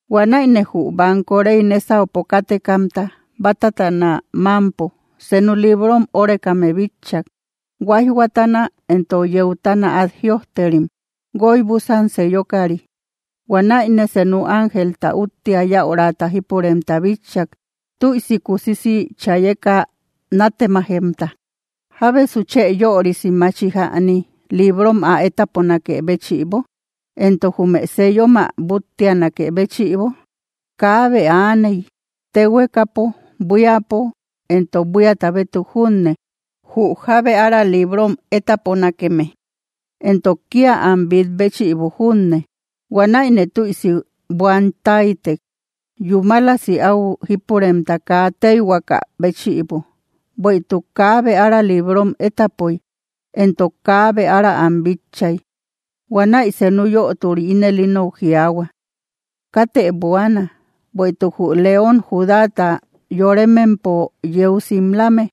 Huanäine jü banko rey nésaupo kátekamta bátatana mámpo, senu librom órekame bitchak. Huáijhuatana entok yeutana át jïojterim, guoy búsan sellokari. Huanäine senu ángelta úttia yaurata jípuremta bitchak, tüisi kusisi chayeka nátemajemta: —¿Jábesu chë yörisi machi jäni, librom ä étaponakë béchïbo?, entok, ¿jume sellom ä búttianakë béchïbo? Kaabe aaney, téhuekapo, buíapo, entok buíata bétuk junne, jü jábe ára liibrom étaponakeme, entok kía am bít béchïbo junne. Huanäine tüisi buan táytek, yúmalasi au jípuremta kaa téyhuaka béchïbo, bueïtuk kaabe ára librom étapoy, entok kaabe ára am bitchay. Huanäi senu yöturi ínel inou jiaahua: —Katë buaana, bueïtuk jü León Judáta yoremempo yeu simlame,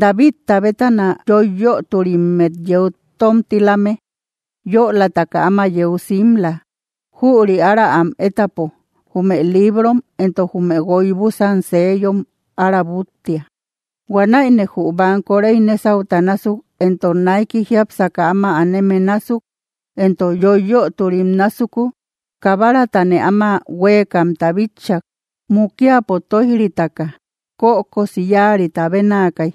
Davidta bétana yoiyöturimmet yeu tómtilame, yölataka áma yeu simla. Jüri ára am étapo, jume liibrom, entok jume guoy búsan seellom ára búttia. Huanäine jü banko rey nésauta násuk entok naiki jiápsaka áma aneme násuk, entok yoiyöturim násuku, Kabaratane áma huéekamta bitchak. Mukiapo tóij‑ritaka kökosi yáarita bénaakay.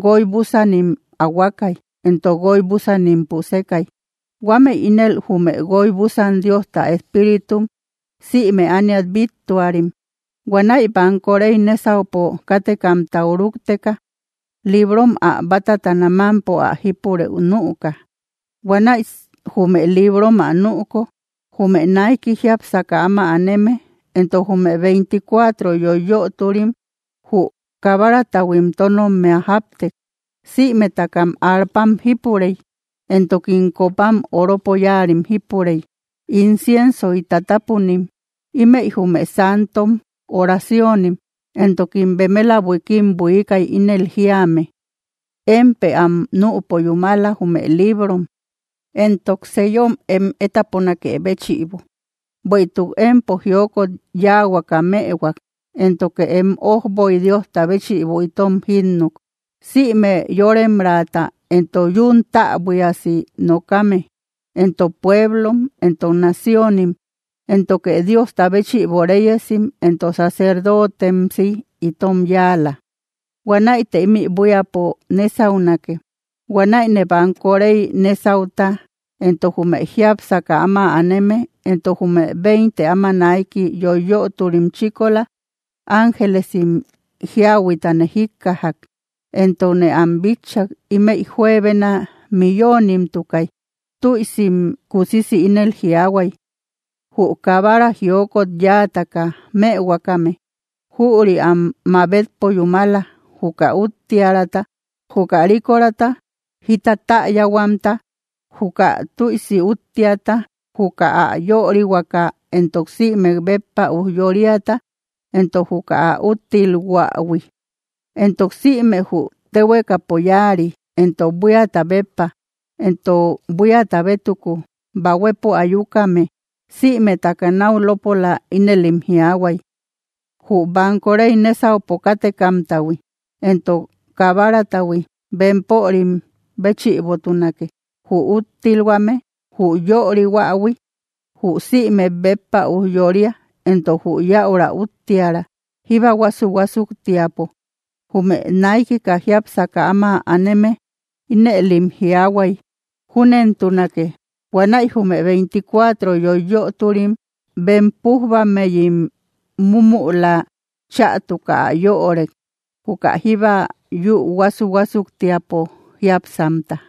Guoy búsanim ahuakay, entok guoy búsanim pusekay. Huámëi ínel jume guoy búsan Diosta espíritum sïme ániat bíttuarim. Huanäi banko rey nésaupo kátekamtau rúkteka, librom ä bátatana mámpo ä jípurëu nüka. Huanäi jume librom ä nüko, jume naiki jiápsaka áma aneme entok jume veinticuatro yoiyöturim jü Kabaratahuim tónommia jáptek. Sïmetakam arpam jípurey, entokim copam oropo yáarim jípurey, inciensoy tatapunim. Ímëi jume santom oraciónim. Entokim bemela buikim buiikay, ínel jíame: Émpë am nüpo yúmala, jume liibrom, entok sellom em étaponakë béchïbo; bueïtuk empo jiokot yáahuaka mëhuak, éntoke em ójboy Diosta béchïbo itom jínnuk, sïme yóremraata, entok yún täbuiasi nokame, entok pueblom, entok naciónim. Éntoke Diosta béchïbo réyesim entok sacerdootemsi itom yáala. Huanäite ímï buíapo nésaunake. Huanäine banko rey nésauta entok jume jiápsaka áma aneme entok jume veinte áma naiki yoiyöturim chíkola, ángelesim jíahuiatane jíkkajak, entokne am bitchak. Ímëi juebena millonimtukay. Tüisim kusisi ínel jiaahuay: Jü Kabara jiokot yáataka mëhuakame, jüri am mabetpo yúmala, juka úttiärata, juka rikorata, jita täyahuamta, juka tüisi úttiata, juka ä yörihuaka entok sïmek béppa ujyóriata, entok juka ä úttilhuähui. Entok sïme jü téhuekapo yáari, entok buíata béppa, entok buíata bétuku, bahuepo ayukame, sïmetaka náu lópola ínëlim jiaahuay: Jü banko rey nésaupo kátekamtahui, entok Kabaratahui, bempörim béchïbotunake, jü úttilhuame, jü yörihuähui, jü sïmek béppa ujyória, entok jü yäura úttiära, jíba huásu‑huásuktiapo. Jume naikika jiápsaka áma aneme ínëlim jiaahuay: —¡Júnentunake! Huanäi jume veinticuatro yoiyöturim bem pújbammeyim múmüla chätuka ä yörek, juka jíba yü huásu‑huásuktiapo jiápsamta.